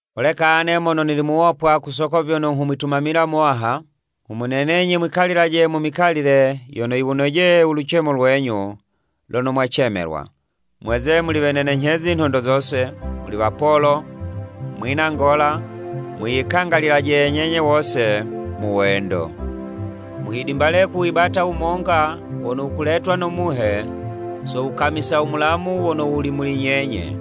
Holeka ane mono nili muwopwa ku soko vyono nghumwitumamila u Muwaha, nghumunenenyi mwikalilaje mu mikalile yono yiwunojeye u lucemo lwenyu lono mwacemelwa. Mweze muli wenenenyhezi nhondo zose, muli wapolo, mwina ngola, mwiyikangalilaje nyenye wose mu wendo. Muhidimbale kuwibata wumonga wono wukuletwa no Muhe so wukamisa u mulamu wono wuli muli nyenye.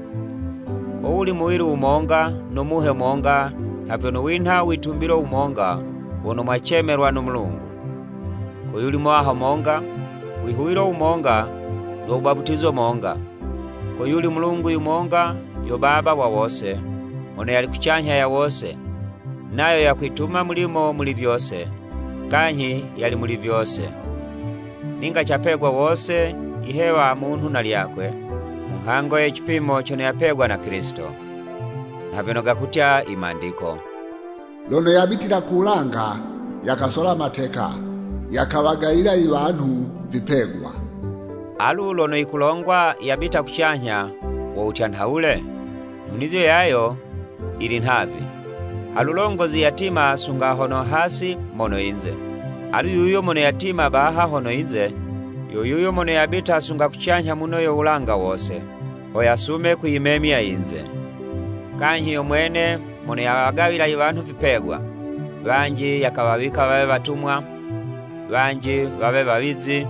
Ko wuli muwili wumonga no Muhe monga nha vyono winha u witumbilo wumonga wono mwacemelwa no Mulungu. Koyuli Muwaha monga, wihuwilo wumonga no wubaputizo monga, ko yuli u Mulungu yumonga yo Baba wa wose, mono yali kucanyha ya wose, nayo yakwituma mulimo muli vyose, kanyhi yali muli vyose. Ninga capegwa wose yihewa munhu na lwakwe, mu nghango ye cipimo cono yapegwa na Kilisito. Nha vyono gakutya i Mandiko: “Lono yabitila ku wulanga yakasola mateka yakawagawila iwanhu vipegwa.” Alu lono yikulongwa yabita kucanyha wo wutya nhawule? Nhunizo yayo yili nhavi, halulongozi yatima sunga hono hasi mono yinze. Alu yuyo mono yatima baha hono yinze, yo yuyo mono yabita sunga kucanyha muno yo wulanga wose, ho yasume kuyimemya yinze. Kanyhi yo mwene mono yawagawila iwanhu vipegwa. Wanji yakawawika wawe watumwa, wanji wawe wawizi,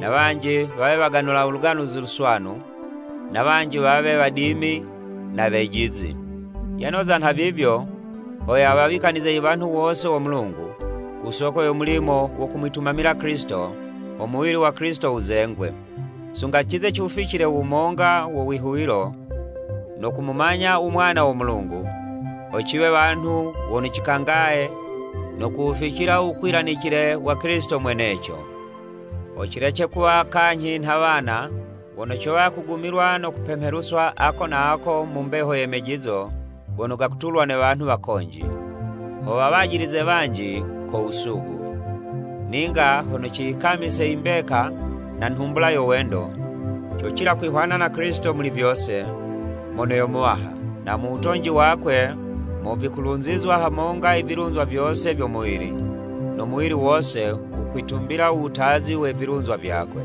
na wanji wawe waganula u Luganuzi Luswanu, na wanji wawe wadimi na wejizi. Yanoza nhavivyo ho yawawikanize i wanhu wose wo Mulungu, ku soko yo mulimo wo kumwitumamila Kilisito ho muwili wa Kilisito wuzengwe. Sunga cize ciwuficile u wumonga wo wihuwilo no kumumanya u Mwana wo Mulungu; ho ciwe wanhu wono cikangaye no kuwuficila u wukwilanicile wa Kilisito mweneco. Ho cilece kuwa kanyhi nha wana, wono cowa kugumilwa no kupemheluswa ako na ako mu mbeho ye mejizo gono gakutulwa ne wanhu wakonji, ho wawajilize wanji ko wusugu. Ninga hono ciyikamise i mbeka na nhumbula yo wendo, cocila kwihwana na Kilisito muli vyose, mono yo Muwaha, na mu wutonji wakwe mo vikulunzizwa hamonga i vilunzwa vyose vyo muwili, no muwili wose wukwitumbila u wutazi we vilunzwa vyakwe.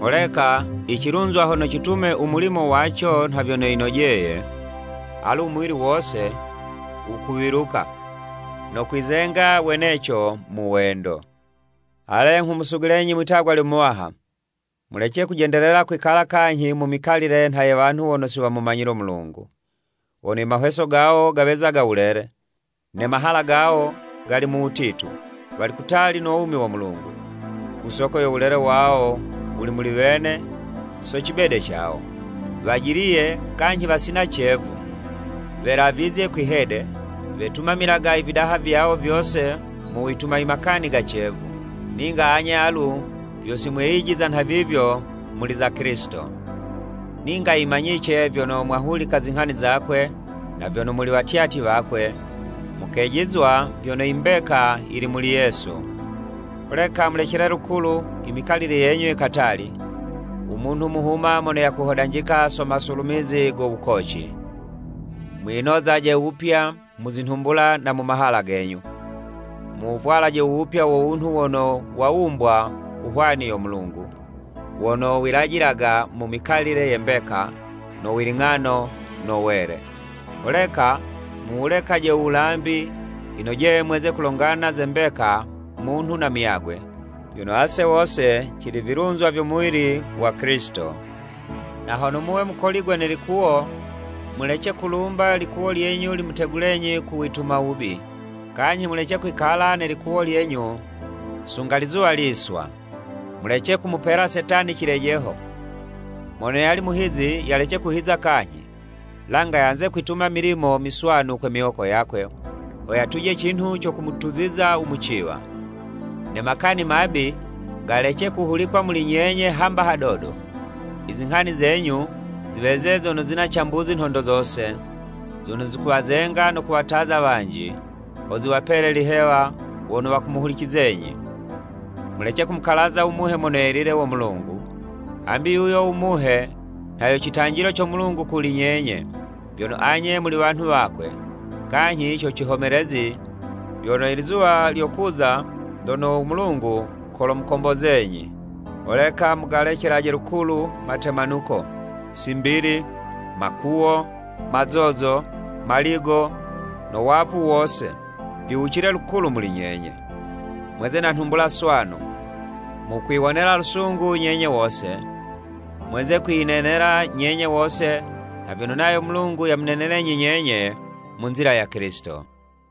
Holeka icilunzwa hono citume u mulimo waco nha vyono yinojeye, ale u muwili wose wukuwiluka no kwizenga weneco mu wendo. Ale, nghumusugulenyi mwitagwa lyo Muwaha, mulece kujendelela kwikala kanyhi mu mikalile nha ye wanhu wono si wamumanyile u Mulungu, wono i mahweso gawo gaweza wulele, ne mahala gawo gali mu wutitu. Wali kutali no wumi wo Mulungu, ku soko yo wulele wono wuli muli wene so cibede cawo. Wajiliye kanyhi wasina cevu, welavizye kwi'hede, wetumamilaga ividaha vyawo vyose mu wituma imakani ga cevu. Ninga anye alu vyo simweyijiza nhavivyo muli za Kilisito. Ninga yimanyice vyono mwahulika zinghani zakwe, na vyono muli watyatyi wakwe, mukejizwa vyono yi mbeka yili muli Yesu. Holeka mulecele lukulu i mikalile yenyu ye katali, u munhu muhuma mono yakuhodanjika so masulumizi go wukoci. Mwinozaje wupya mu zinhumbula na mu mahala genyu. Muwuvwalaje u wupya wo wunhu wono wawumbwa ku hwani yo Mulungu, wono wilajilaga mu mikalile ye mbeka, no wiling'ano no wele. Holeka muwulekaje u wulambi, yinojeye mweze kulongana ze mbeka munhu na muyagwe, vyono ase wose cili vilunzwa vyo muwili wa Kilisito. Na hono muwe mukoligwe ne likuwo, mulece kulumba ilikuwo lyenyu limutegulenyi ku wituma wubi, kanyhi mulece kwikala ne likuwo lyenyu sunga lizuwa liswa. Mulece kumupela Setani cilejeho. Mono yali muhizi, yalece kuhiza kanyhi, langa yanze kwituma i milimo miswanu kwe miwoko yakwe, ho yatuje cinhu co kumutuziza u muciwa. Ne makani mabi galece kuhulikwa muli nyenye hamba hadodo, izinghani zenyu ziweze zono zina cambuzi nhondo zose, zono zikuwazenga no kuwataza wanji, ho ziwapele lihewa wono wakumuhulicizenyi. Mulece kumukalaza u Muhe Mono Yelile wo Mulungu, hambi yuyo u Muhe nha yo citanjilo co Mulungu kuli nyenye, vyono anye muli wanhu wakwe, kanyhi co cihomelezi vyono ilizuwa lyokuza lono u Mulungu kolomukombozenyi. Holeka mugalecelaje lukulu matemanuko, simbili, makuwo, mazozo, maligo, no wavu wose, viwucile lukulu muli nyenye. Mweze na nhumbula swanu, mukwiwonela lusungu nyenye wose, mweze kwiyinenela nyenye wose nha vyono nayo u Mulungu yamunenelenyi nyenye mu nzila ya Kilisito.